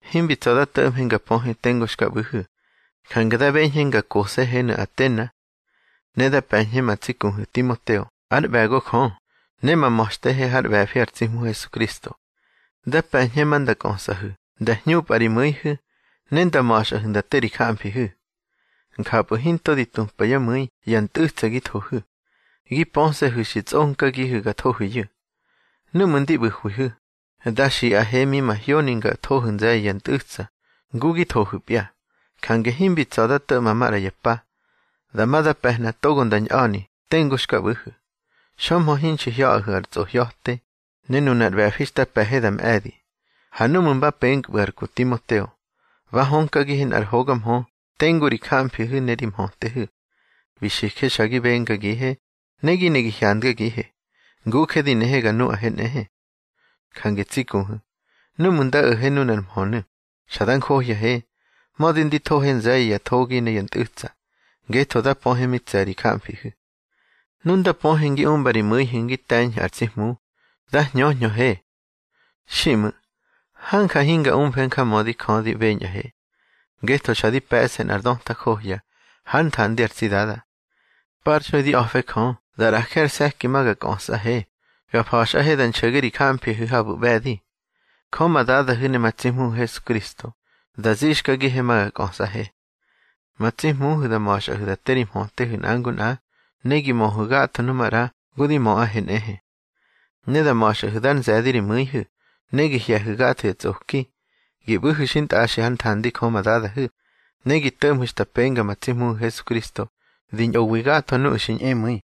Himbi tsa̱ da to̱ꞌmhe nga pöhe tengu xka ꞌbu̱hu̱, jange da beñhe nga kose̱henu̱ Atena. Ne da pe̱ñhe ma tsi kuhu̱ Timoteo ár ꞌbe̱go Jö, ne ma ma̱xtehe hár ꞌbe̱fi ar tsi Hmu Hesukristo. Da pe̱ñhe ma nda kꞌösꞌahu̱ nda hñupꞌa ri mu̱ihu̱, ne nda ma̱xꞌahu̱ nda te ri jamfihu̱. Njapꞌu̱ hinto di tupa yá mu̱i ya ntꞌu̱tsa gi thohu̱. Gi pöse̱hu̱ xi tsꞌonkagihu̱ ga thohu̱yu̱. Núꞌmu̱ ndi ꞌbu̱hwihu̱, da xiꞌahe mi mahyoni nga thohu̱ nze̱ye̱ ya ntꞌu̱tsa ngu gi thohu̱pya. Jange himbi tsa̱ da to̱ꞌma maꞌra ya pa. Dama da pe̱hna togo nda ñꞌa̱ni tengu xka ꞌbu̱hu̱, xömhö hinxi hya̱ꞌahu̱ ar tsꞌohya̱te, ne nunar ꞌbe̱fi xta pe̱he da mꞌe̱di. Ha núꞌmu̱ mba penkpꞌu̱ ar ku Timoteo, ba hönkagihe ar hoga mhö tengu ri jamfihu̱ ne ri mhötehu̱. Bi xije xa gi bengagihe, ne gi ne gi hyandgagihe, nguje di nehe ga nuꞌahe nꞌehe. Jange tsi kuhu̱, núꞌmu̱ nda o̱he nunar mhönu̱, xa da njohyahe, mödi ndi thohe nze̱ye̱ ya thogi ne ya ntꞌu̱tsa, ngetho da pöhe mi tse̱ ri jamfihu̱. Nu nda pöhe ngi umba ri mu̱ihu̱ ngi te̱ñhu̱ ar tsi Hmu, da hñöhñöhe. Xiꞌmu̱, hanja hinga umfe njamödi Jö di beñꞌahe. Ngetho xa di pe̱ꞌse nꞌar döta johya hár nthandi ar tsi Dada. Parxui di a̱fe Jö da ꞌraje ar se̱ki ma ga kꞌösꞌahe ga fa̱xꞌahe da nxo̱ge ri jamfihu̱ habu̱ ꞌbe̱di. Jö ma Dadahu̱ ne ma tsi Hmuhu̱ Hesukristo da zixkagihe ma ga kꞌösꞌahe. Ma tsi Hmuhu̱ da ma̱xꞌahu̱ da te ri mhötehu̱ nꞌa ngu nꞌa, ne gi möhu̱ gatho nu maꞌra ngu di möꞌahe nꞌehe. Ne da ma̱xꞌahu̱ dar nze̱di ri mu̱ihu̱, ne gi hye̱hu̱ gatho ya tsꞌoki. Gi ꞌbu̱hu̱ xintꞌaxi hár nthandi Jö ma Dadahu̱, ne gi to̱ꞌmhu̱ xta penga ma tsi Hmuhu̱ Hesukristo di ñꞌowi gatho nuꞌu̱ xi ñꞌemu̱i.